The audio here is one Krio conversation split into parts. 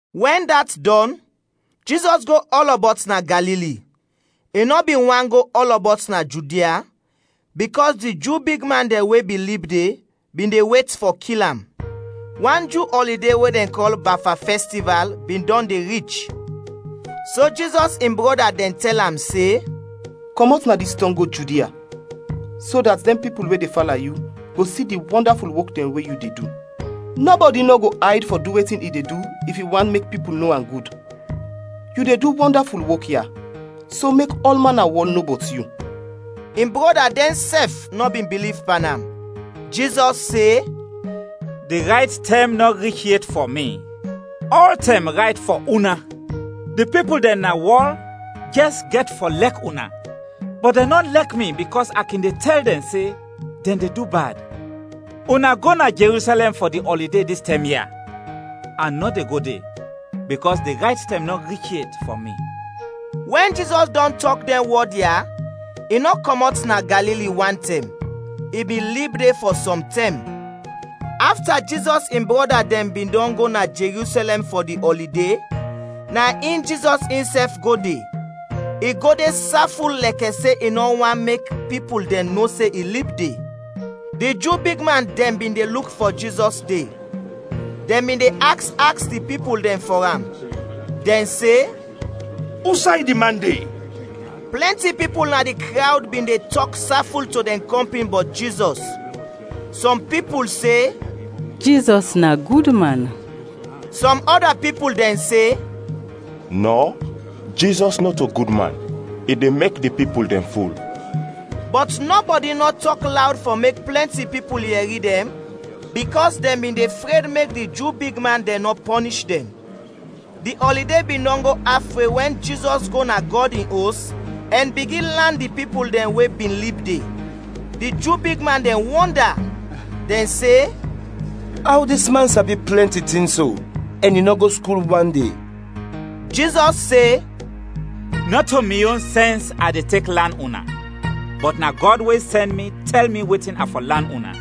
Wɛn dat dɔn, Jizɔs go ɔlɔbɔt na Galili; i nɔ bin want go ɔlɔbɔt na Judia, bikɔs di Ju bigman dɛn we bin lib de bin de wet fɔ kil am. Wan Ju ɔlide we dɛn kɔl “Bafa Fɛstival” bin dɔn de rich. So Jizɔs in brɔda dɛn tɛl am se, “Kɔmɔt na dis tɔng go Judia, so dat dɛn pipul we de fala yu, go si di wɔndaful wok dɛn we yu de du. Nɔbɔdi nɔ go ayd fɔ du wetin i de du if i want mek pipul no am gud. Yu de du dɛn wɔndaful wok ya, so mek ɔlman na wɔl no bɔt yu!” (In brɔda dɛnsɛf nɔ bin biliv pan am). Jizɔs se, “Di rayt tɛm nɔ rich yet fɔ mi. Ɔltɛm rayt fɔ una. Di pipul dɛn na wɔl jɛs gɛt fɔ lɛk una, bɔt dɛn nɔ lɛk mi bikɔs a kin de tɛl dɛn se, dɛn de du bad. Una go na Jerusɛlɛm fɔ di ɔlide dis tɛm ya, a nɔ de go de, bikɔs di rayt tɛm nɔ rich yet fɔ mi.” Wɛn Jizɔs dɔn tɔk dɛn wɔd ya, i nɔ kɔmɔt na Galili wantɛm; i bin lib de fɔ sɔm tɛm. Afta Jizɔs in brɔda dɛn bin dɔn go na Jerusɛlɛm fɔ di ɔlide, na in Jizɔs insɛf go de. I go de saful lɛkɛ se i nɔ want mek pipul dɛn no se i lib de. Di Ju bigman dɛn bin de luk fɔ Jizɔs de. Dɛn bin de aks aks di pipul dɛn fɔ am. Dɛn se, “Usay di man de?” Plɛnti pipul na di krawd bin de tɔk saful to dɛn kɔmpin bɔt Jizɔs. Sɔm pipul se, “Jizɔs na gud man.” Sɔm ɔda pipul dɛn se, “Nɔ, Jizɔs nɔto gud man, i de mek di pipul dɛn ful.” Bɔt nɔbɔdi nɔ tɔk lawd fɔ mek plɛnti pipul yɛri dɛn bikɔs dɛn bin de fred mek di Ju bigman dɛn nɔ pɔnish dɛn. Di ɔlide bin dɔn go af we wɛn Jizɔs go na Gɔd in Os ɛn bigin lan di pipul dɛn we bin lib de. Di Ju bigman dɛn wɔnda, dɛn se, “Aw dis man sabi plɛnti tin so, ɛn i nɔ go skul wan de?” Jizɔs se, “Nɔto mi yon sɛns a de tek lan una, bɔt na Gɔd we sɛn mi tɛl mi wetin a fɔ lan una.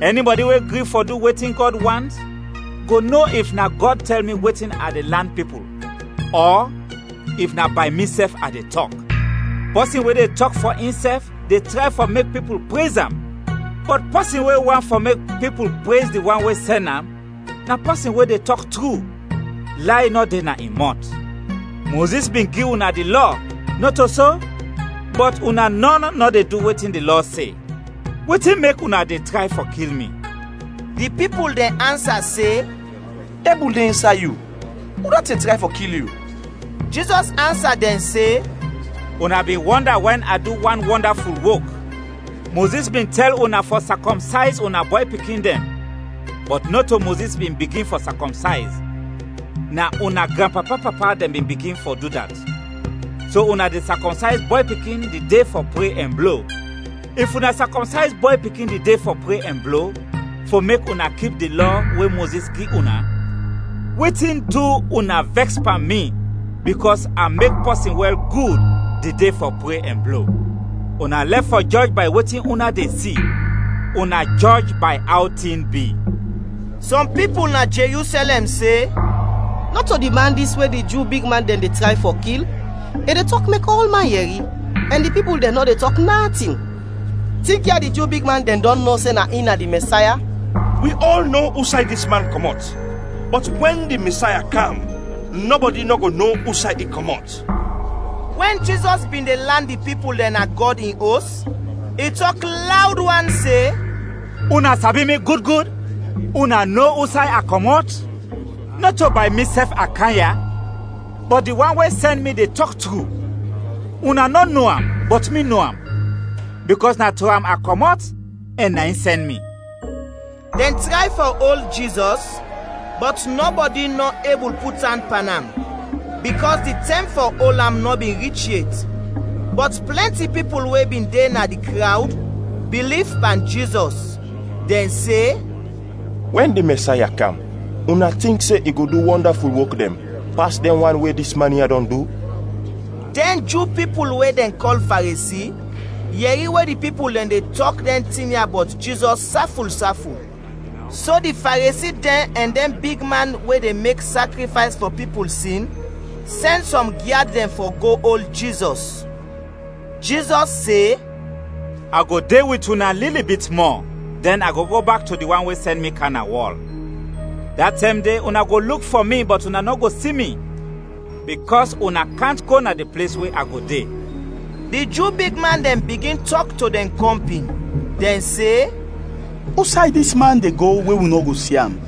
Ɛnibɔdi we gri fɔ du wetin Gɔd want, go no if na Gɔd tɛl mi wetin a de lan pipul ɔ if na bay misɛf a de tɔk. Pɔsin we de tɔk fɔ insɛf de tray fɔ mek pipul prez am. Bɔt pɔsin we want fɔ mek pipul prez di wan we sɛn am, na pɔsin we de tɔk tru, lay nɔ de na in mɔt. Mozis bin gi una di Lɔ, nɔto so? Bɔt una nɔn nɔ de du wetin di Lɔ se. Wetin mek una de tray fɔ kil mi?” Di pipul dɛn ansa se, “Dɛbul de insay yu! Udat de tray fɔ kil yu?” Jizɔs ansa dɛn se, “Una bin wɔnda wɛn a du wan wɔndaful wok. Mozis bin tɛl una fɔ sakɔmsayz una bɔy pikin dɛn (bɔt nɔto Mozis bin bigin fɔ sakɔmsayz, na una granpapa-papa dɛn bin bigin fɔ du dat), so una de sakɔmsayz bɔy pikin di de fɔ pre ɛn blo. If una sakɔmsayz bɔy pikin di de fɔ pre ɛn blo, fɔ mek una kip di Lɔ we Mozis gi una, wetin du una vɛks pan mi bikɔs a mek pɔsin wɛl gud di de fɔ pre ɛn blo? Una lɛf fɔ jɔj bay wetin una de si, una jɔj bay aw tin bi.” Sɔm pipul na Jerusɛlɛm se, “Nɔto di man dis we di Ju bigman dɛn de tray fɔ kil? I de tɔk mek ɔlman yɛri, ɛn di pipul dɛn nɔ de tɔk natin! Tinkya di Ju bigman dɛn dɔn no se na in na di Mɛsaya? Wi ɔl no usay dis man kɔmɔt; bɔt wɛn di Mɛsaya kam, nɔbɔdi nɔ go no usay i kɔmɔt.” Wɛn Jizɔs bin de lan di pipul dɛn na Gɔd in Os, i tɔk lawd wan se, “Una sabi mi gud gud? Una no usay a kɔmɔt? Nɔto bay misɛf a kam ya, bɔt di wan we sɛn mi de tɔk tru. Una nɔ no am, bɔt mi no am, bikɔs na to am a kɔmɔt ɛn na in sɛn mi.” Dɛn tray fɔ ol Jizɔs, bɔt nɔbɔdi nɔ ebul put an pan am, bikɔs di tɛm fɔ ol am nɔ bin rich yet. Bɔt plɛnti pipul we bin de na di krawd biliv pan Jizɔs, dɛn se, “Wɛn di Mɛsaya kam, una tink se i go du wɔndaful wok dɛn pas dɛn wan we dis man ya dɔn du?” Dɛn Ju pipul we dɛn kɔl Faresi yɛri we di pipul dɛn de tɔk dɛn tin ya bɔt Jizɔs saful saful, so di Faresi dɛn ɛn dɛn bigman we de mek sakrifays fɔ pipul sin sɛn sɔm gyad dɛn fɔ go ol Jizɔs. Jizɔs se, “A go de wit una lili bit mɔ, dɛn a go go bak to di Wan we sɛn mi kam na wɔl. Da tɛm de una go luk fɔ mi bɔt una nɔ go si mi, bikɔs una kant go na di ples we a go de.” Di Ju bigman dɛn bigin tɔk to dɛn kɔmpin, dɛn se, “Usay dis man de go we wi nɔ go si am?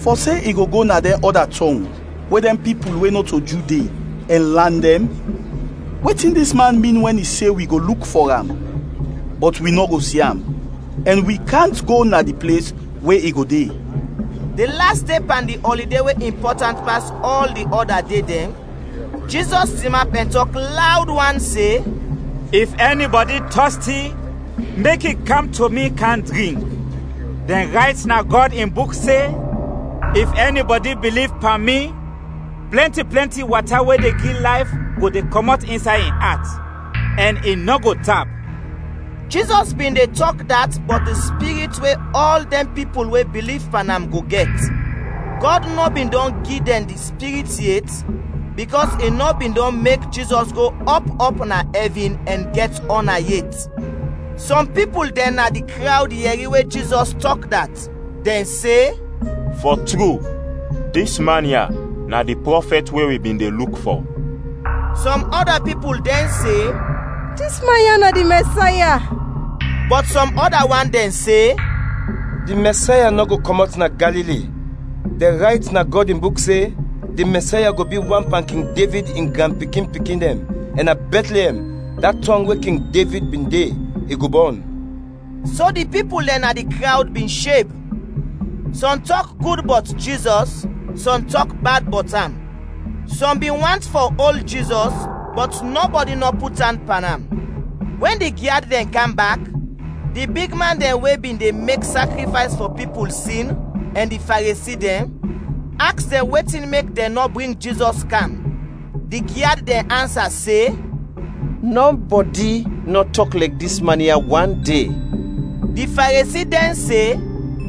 Fɔ se i go go na dɛn ɔda tɔng we dɛn pipul we nɔto Ju de, ɛn lan dɛn? Wetin dis man min wɛn i se wi go luk fɔ am, bɔt wi nɔ go si am, ɛn wi kant go na di ples we i go de?” Di las de pan di ɔlide we impɔtant pas ɔl di ɔda de dɛn, Jizɔs tinap ɛn tɔk lawd wan se, “If ɛnibɔdi tɔsti mek i kam to mi, kam drink. Dɛn rayt na Gɔd in Buk se, ‘If ɛnibɔdi biliv pan mi, plɛnti plɛnti wata we de gi layf go de kɔmɔt insay in at, ɛn i nɔ go tap.’” Jizɔs bin de tɔk dat bɔt di Spirit we ɔl dɛn pipul we biliv pan am go gɛt. Gɔd nɔ bin dɔn gi dɛn di Spirit yet, bikɔs i nɔ bin dɔn mek Jizɔs go ɔp ɔp na ɛvin ɛn gɛt ɔna yet. Sɔm pipul dɛn na di krawd yɛri we Jizɔs tɔk dat, dɛn se, “Fɔ tru, dis man ya na di prɔfɛt we wi bin de luk fɔ!” Sɔm ɔda pipul dɛn se, “Dis man ya na di Mɛsaya!” Bɔt sɔm ɔda wan dɛn se, “Di Mɛsaya nɔ go kɔmɔt na Galili. Dɛn rayt na Gɔd in Buk se, di Mɛsaya go bi wan pan King Devid in granpikin-pikin dɛn ɛn na Bɛtliɛm, da tɔng we King Devid bin de, i go bɔn.” So di pipul dɛn na di krawd bin sheb. Sɔm tɔk gud bɔt Jizɔs, sɔm tɔk bad bɔt am. Sɔm bin want fɔ ol Jizɔs, bɔt nɔbɔdi nɔ put an pan am. Wɛn di gyad dɛn kam bak, di bigman dɛn we bin de mek sakrifays fɔ pipul sin ɛn di Faresi dɛn, aks dɛn wetin mek dɛn nɔ bring Jizɔs kam. Di gyad dɛn ansa se, “Nɔbɔdi nɔ tɔk lɛkɛ dis man ya wande.” Di Faresi dɛn se,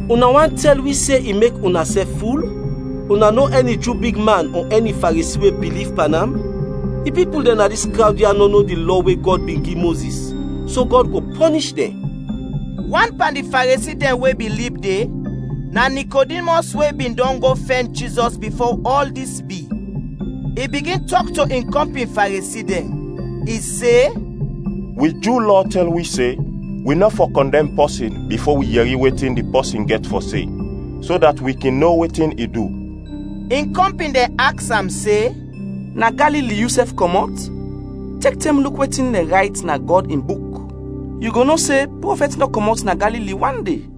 “Una want tɛl wi se i mek unasɛf ful? Una no ɛni Ju bigman ɔ ɛni Faresi we biliv pan am? Di pipul dɛn na dis krawd ya nɔ no di Lɔ we Gɔd bin gi Mozis, so Gɔd go pɔnish dɛn!” Wan pan di Faresi dɛn we bin lib de, na Nikodimɔs we bin dɔn go fɛn Jizɔs bifo ɔl dis bi. I bigin tɔk to in kɔmpin Faresi dɛn; i se, “Wi Ju Lɔ tɛl wi se wi nɔ fɔ kɔndɛm pɔsin bifo wi yɛri wetin di pɔsin gɛt fɔ se, so dat wi kin no wetin i du.” In kɔmpin dɛn aks am se, “Na Galili yusɛf kɔmɔt? Tek tɛm luk wetin dɛn rayt na Gɔd in Buk, yu go no se prɔfɛt nɔ kɔmɔt na Galili wande.”